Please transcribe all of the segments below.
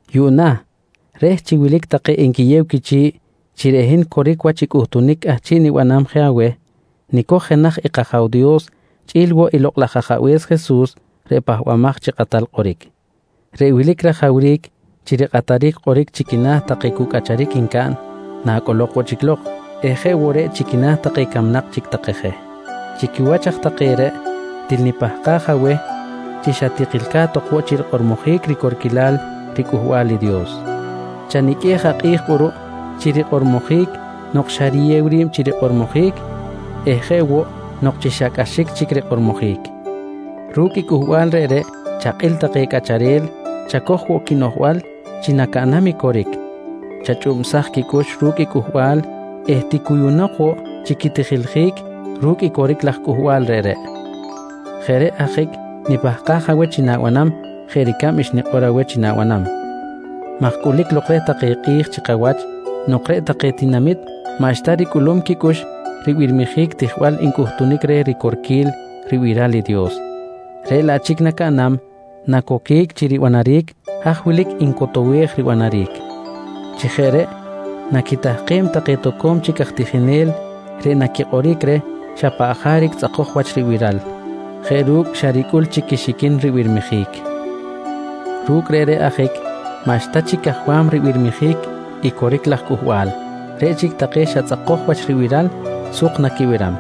Yuꞌna reh chi wilic take enquiyew quichi̱ꞌ chi reꞌ hin coric wach i cꞌuhtunic cꞌahchiꞌ nibanam je aweh, nicoj jenaj i kAja̱w Dios chꞌi̱l woꞌ i Lokꞌ laj Ajabe̱s Jesus reꞌ Pahbamaj chi Kꞌatal Kꞌoric. Reꞌreꞌ wilic rajawric chi rikꞌataric kꞌoric chi quina̱ take cu cꞌacharic ncaꞌn nacꞌolok woꞌ chic lok eh jeꞌ woꞌ reꞌ chi quina̱ take camnak chic take je. Chi quiwach aj take reꞌ, til nipahkaj aweh chi xa tikilca̱t ok woꞌ chi rikꞌormojic ricorquilal riCꞌuhbal i Dios. Chaniqꞌuej akꞌi̱j kꞌuruꞌ chi rikꞌormojic nok xa riyew ri̱b chi kꞌormojic eh jeꞌ woꞌ nok chi cꞌaxic chic rikꞌormojic. Ru̱cꞌ i cꞌuhbal reꞌreꞌ chakꞌil take cꞌacharel, chacoj woꞌ quinoꞌjbal chi nacaꞌnam i coric, chachꞌubsaj quicꞌux ru̱cꞌ i cꞌuhbal eh ticuyunok woꞌ chi quitijiljic ru̱cꞌ i coric laj cꞌuhbal reꞌreꞌ. Jeꞌ reꞌ ajic nipahkaj aweh chi na̱banam jeꞌ ricab xnikꞌor aweh chi na̱banam maj cꞌulic lok reh take kꞌi̱j chi kawach nok reꞌ take tinamit maꞌxta ricꞌulum quicꞌux ribirmijic tijbal ncꞌuhtunic reh ricorquil ribiral i Dios, reꞌ laꞌ chic nacaꞌnam, nacoquic chi ribanaric haj wilic ncotowej ribanaric. Chi jeꞌ reꞌ naquitahkem take toco̱m chic aj tijinel reꞌ naquikꞌoric reh xa paꞌ jaric tzꞌakoj wach ribiral jeꞌ ru̱cꞌ xa ricꞌul chic quixiquin ribirmijic. Ru̱cꞌ reꞌreꞌ ajic maꞌxta chic cajwam ribirmijic i coric laj cꞌuhbal, reꞌ chic take xa tzꞌakoj wach ribiral suk naquibiram.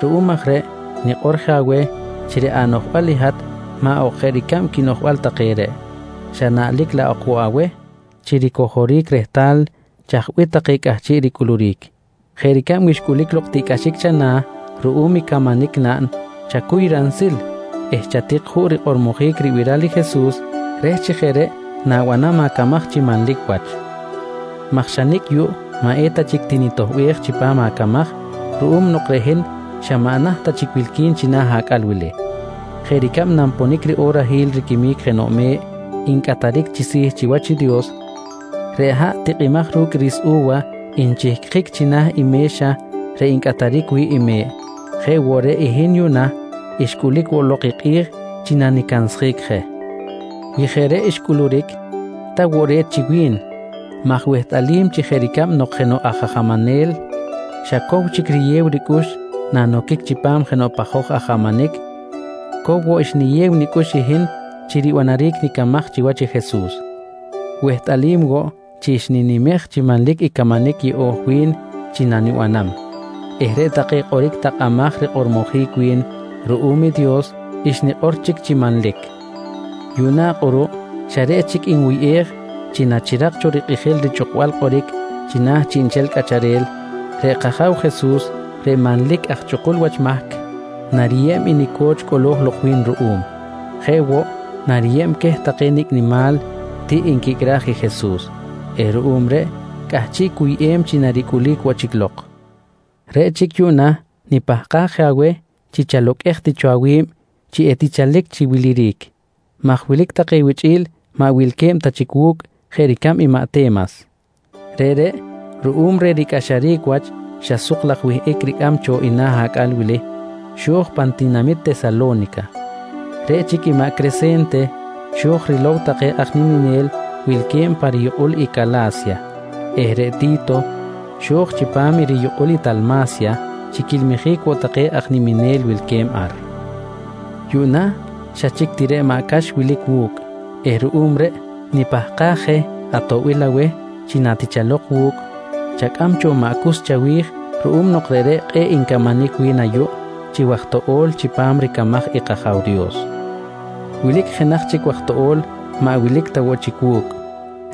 Ruꞌum aj reꞌ nikꞌor je aweh chi reꞌ anoꞌjbal i hat maꞌ ok jeꞌ ricab quinoꞌjbal take reꞌ, xa naꞌlic laꞌ ok woꞌ aweh chi ricojoric rehtal chaj bih take cꞌahchiꞌ ricꞌuluric. Jeꞌ ricab wi xcꞌulic lok tiꞌcꞌaxic chana̱ ruꞌum i camanic naꞌn chacuy ransil eh chatik juꞌ rikꞌormojic i ribiral i Jesus reh chi jeꞌ reꞌ na̱banam acamaj chi manlic wach maj xa nicꞌ yuꞌ maꞌ eta chic tinitoꞌbej chipam acamaj ruꞌum nok reꞌ hin xa maꞌ naht ta chic wilqui̱n china̱ acꞌal wili. Jeꞌ ricab nanponic riꞌorahil riquimic jenoꞌ me̱ꞌ ncꞌataric chi si̱ chiwach i Dios, reꞌ haꞌ tikꞌimaj ru̱cꞌ ri̱s u̱wa nchihcjic china̱ i me̱xa reꞌ ncꞌataric wi̱ꞌ i me̱ꞌ, jeꞌ woꞌ reꞌ i hin yuꞌna, xcꞌulic woꞌ lok i kꞌi̱j chi nanicansjic je. Wi jeꞌ reꞌ xcꞌuluric, ta woꞌ re̱t chi wi̱n maj wehtꞌalim chi jeꞌ ricab nok jenoꞌ aj ajamanel xa cow chic riyew ricꞌux nanoquic chipam jenoꞌ pajoj ajamanic, cow woꞌ xniyew nicꞌux i hin chi ribanaric nicamaj chiwach i Jesus. Wehtꞌalim woꞌ chi xninimej chi manlic i camanic yeꞌo̱j wi̱n chi nanibanam eh reꞌ take kꞌoric takꞌamaj rikꞌormojic wi̱n ruꞌum i Dios xnikꞌor chic chi manlic. Yuꞌna kꞌuruꞌ xa reꞌ chic nwuyꞌej chi nachirak cho rikꞌijil richꞌukbal kꞌoric china̱ chiꞌnchel cꞌacharel, reꞌ kAja̱w Jesus, reꞌ manlic aj chꞌukul wach mahc, nariyeb i nico̱ch cꞌolo̱j lok wi̱n ruꞌum jeꞌ woꞌ nariyeb queh take nicꞌ nimal tiꞌ nquicꞌraj i Jesus eh ruꞌum reꞌ cꞌahchiꞌ cuyꞌem chi naricꞌulic woꞌ chic lok. Reꞌ chic yuꞌna nipahkaj je aweh chi chaloqꞌuej ti cho awi̱b chi etichalic chi wiliric, maj wilic take wichꞌi̱l maꞌ wilque̱b ta chic wu̱cꞌ jeꞌ ricab i maꞌ Te̱mas. Reꞌreꞌ ruꞌum reh ricꞌaxaric wach xa suk laj wihꞌic ricꞌam cho i na̱ acꞌal wili, xo̱j pan tinamit Tesalo̱nica. Reꞌ chic i maꞌ Crese̱nte xo̱j rilow take aj niminel wilque̱b pa riyukꞌul i Cala̱sya eh reꞌ Ti̱to xo̱j chipam i riyukꞌul i Talma̱sya chi quilmijic woꞌ take aj niminel wilque̱b ar. Yuꞌna xa chic ti reꞌ maꞌ Cax wilic wu̱cꞌ eh ruꞌum reꞌ nipahkaj je atoꞌbil aweh chi natichalok wu̱cꞌ, chacꞌam cho maꞌ Cus chawi̱j ruꞌum nok reꞌreꞌ kꞌe̱ꞌ encamanic wi̱n ayuꞌ chi waj toꞌo̱l chipam ricamaj i kAja̱w Dios. Wilic jenaj chic waj toꞌo̱l maꞌ wilic ta woꞌ chic wu̱cꞌ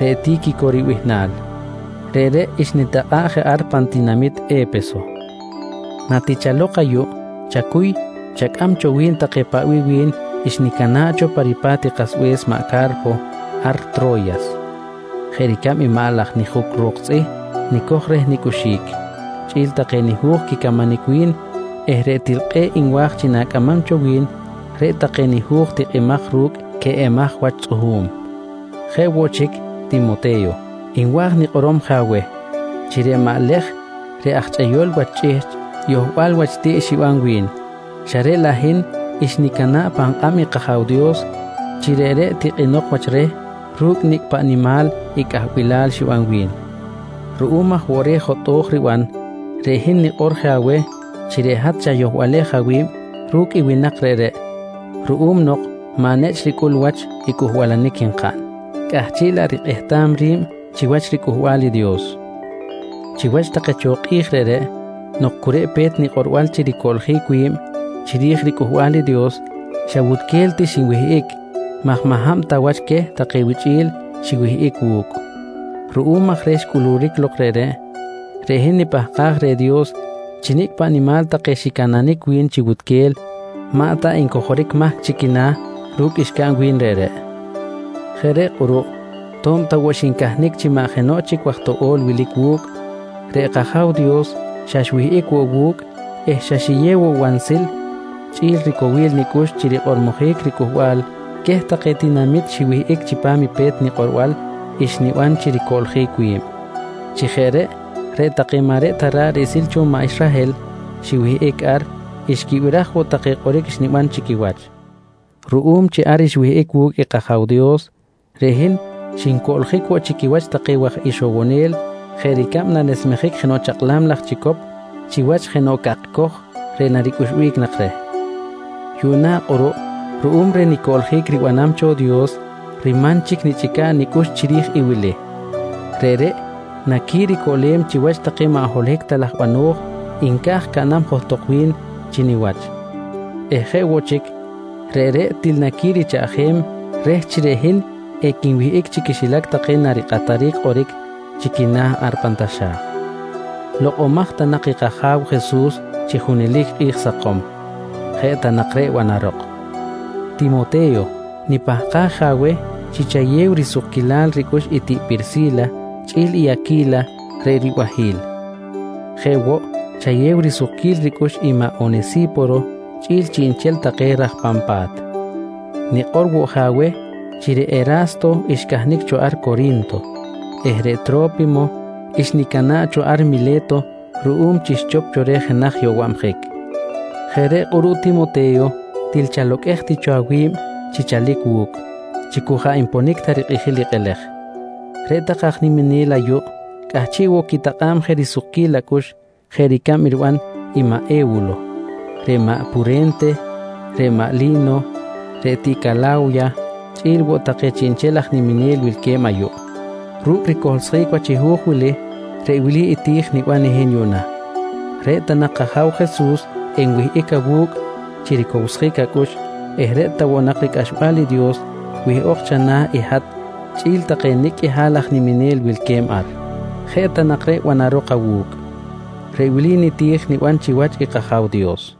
reꞌ Ti̱quico ribihnal. Reꞌreꞌ xnitakꞌa̱ꞌ je ar pan tinamit E̱peso. Natichalok ayuꞌ, chacuy chacꞌam cho wi̱n take paꞌ bih wi̱n xnicana̱ꞌ cho pa ripa̱t i kasbe̱s maꞌ Ca̱rpo ar Tro̱yas, jeꞌ ricab i maꞌ laj nijuc ro̱k tzꞌih nicoj reh nicꞌuxic, chꞌi̱l take nihu̱j quicamanic wi̱n eh reꞌ til kꞌe̱ꞌ nwa̱j chi na̱cꞌamam cho wi̱n reꞌ take nihu̱j tikꞌimaj ru̱cꞌ queꞌemaj wach tzꞌuhu̱m. Jeꞌ woꞌ chic Timote̱yo nwa̱j nikꞌorom je aweh, chi reꞌ maꞌ Lej reꞌ aj chꞌeyol wach chꞌihchꞌ, yohbal wach tiꞌ xiban wi̱n, xa reꞌ laꞌ hin xnicana̱ꞌ pan kꞌab i kAja̱w Dios chi reꞌreꞌ tikꞌinok wach reh ru̱cꞌ nicꞌ paꞌ nimal i cꞌahbilal xiban wi̱n. Ruꞌum aj woꞌ reh jotꞌo̱j riban, reꞌ hin nikꞌor je aweh chi reꞌ hat chayohbalej awi̱b ru̱cꞌ i winak reꞌreꞌ ruꞌum nok maꞌ nechꞌ ricꞌul wach i cꞌuhbalanic nkaꞌn, cꞌahchiꞌ laꞌ rikꞌehtam ri̱b chiwach riCꞌuhbal i Dios. Chiwach take cho kꞌi̱j reꞌreꞌ nok cu reꞌ pe̱t nikꞌorbal chi ricoꞌljic wi̱b chiri̱j riCꞌuhbal i Dios, xa wutquel ti xinwihꞌic maj maꞌ hab ta wach queh take wichꞌi̱l xiwihꞌic wu̱cꞌ. Ruꞌum aj reh xcꞌuluric lok reꞌreꞌ, reꞌ hin nipahkaj reh Dios chi nicꞌ paꞌ nimal take xicananic wi̱n chi wutquel, maꞌ ta encojoric mahc chi quina̱ ru̱cꞌ xcaꞌn wi̱n reꞌreꞌ. Jeꞌ reꞌ kꞌuruꞌ to̱b ta woꞌ xincahnic chi maꞌ jenoꞌ chic waj toꞌo̱l wilic wu̱cꞌ, reꞌ kAja̱w Dios xa xwihꞌic woꞌ wu̱cꞌ eh xa xiyew woꞌ wansil chꞌi̱l ricowil nicꞌux chi rikꞌormojic ricꞌuhbal queh take tinamit xiwihꞌic chipam i pe̱t nikꞌorbal xniban chi ricoꞌljic wi̱b. Chi jeꞌ reꞌ, reꞌ take maꞌ reꞌ ta ra̱ꞌ riꞌsil cho maꞌ Israhel xiwihꞌic ar xquibiraj woꞌ take kꞌoric xniban chi quiwach. Ruꞌum chi ar xwihꞌic wu̱cꞌ i kAja̱w Dios, reꞌ hin xincoꞌljic woꞌ chi quiwach take waj ixowonel jeꞌ ricab nanesmejic jenoꞌ chakꞌlam laj chicop chiwach jenoꞌ cakcoj reꞌ naricꞌuxbic nak reh. Yuꞌna kꞌuruꞌ ruꞌum reh nicoꞌljic ribanam cho Dios riman chic nichꞌica̱ꞌ nicꞌux chiri̱j i wili: Reꞌreꞌ naquiricoꞌlem chiwach take maꞌ holohic ta laj bano̱j nca̱j caꞌnam johtok wi̱n chi niwach eh jeꞌ woꞌ chic, reꞌreꞌ til naquirichaꞌjem reh chi reꞌ hin equinwihꞌic chi quixilac take narikꞌataric kꞌoric chi quina̱ ar pan taxa̱j. Lokꞌomaj ta nak i kAja̱w Jesus chi junelic kꞌi̱j sakom. Jeꞌ ta nak reꞌ banarok. Timote̱yo, nipahkaj je aweh chi chayew risukquilal ricꞌux i tiꞌ Pirsi̱la chꞌi̱l Aqui̱la reꞌ ribahi̱l. Jeꞌ woꞌ chayew risukquil ricꞌux i maꞌ Onesi̱poro chꞌi̱l chiꞌnchel take i raj pan pa̱t. Nikꞌor woꞌ je aweh chi reꞌ Era̱sto xcahnic cho ar Cori̱nto eh reꞌ Tro̱pimo xnicana̱ꞌ cho ar Mile̱to ruꞌum chi xchop cho reh jenaj yowabjic. Jeꞌ reꞌ kꞌuruꞌ Timote̱yo til chaloqꞌuej ti cho awi̱b chi chalic wu̱cꞌ chi cu jaꞌ nponic ta rikꞌijil i kꞌelej. Reꞌ take aj niminel ayuꞌ cꞌahchiꞌ woꞌ quitakꞌa̱b je risukquil acꞌux jeꞌ ricab maꞌ E̱wulo, reꞌ maꞌ Pure̱nte, reꞌ maꞌ Li̱no, reꞌ tiꞌ Cala̱wya chꞌi̱l woꞌ take chiꞌnchel aj niminel wilque̱b ayuꞌ. Ru̱cꞌ ricohlsjic wach i hu̱j wili, reꞌ wili i ti̱j niban i hin yuꞌna: Reꞌ ta nak kAja̱w Jesus enwihꞌic awu̱cꞌ chi ricowsjic acꞌux eh reꞌ ta woꞌ nak ricꞌaxbal i Dios wihꞌok chana̱ i hat chꞌi̱l take nicꞌ qꞌuihal aj niminel wilque̱b ar. Jeꞌ ta nak reꞌ banarok awu̱cꞌ tak. Reꞌ wili niti̱j niban chiwach i kAja̱w Dios.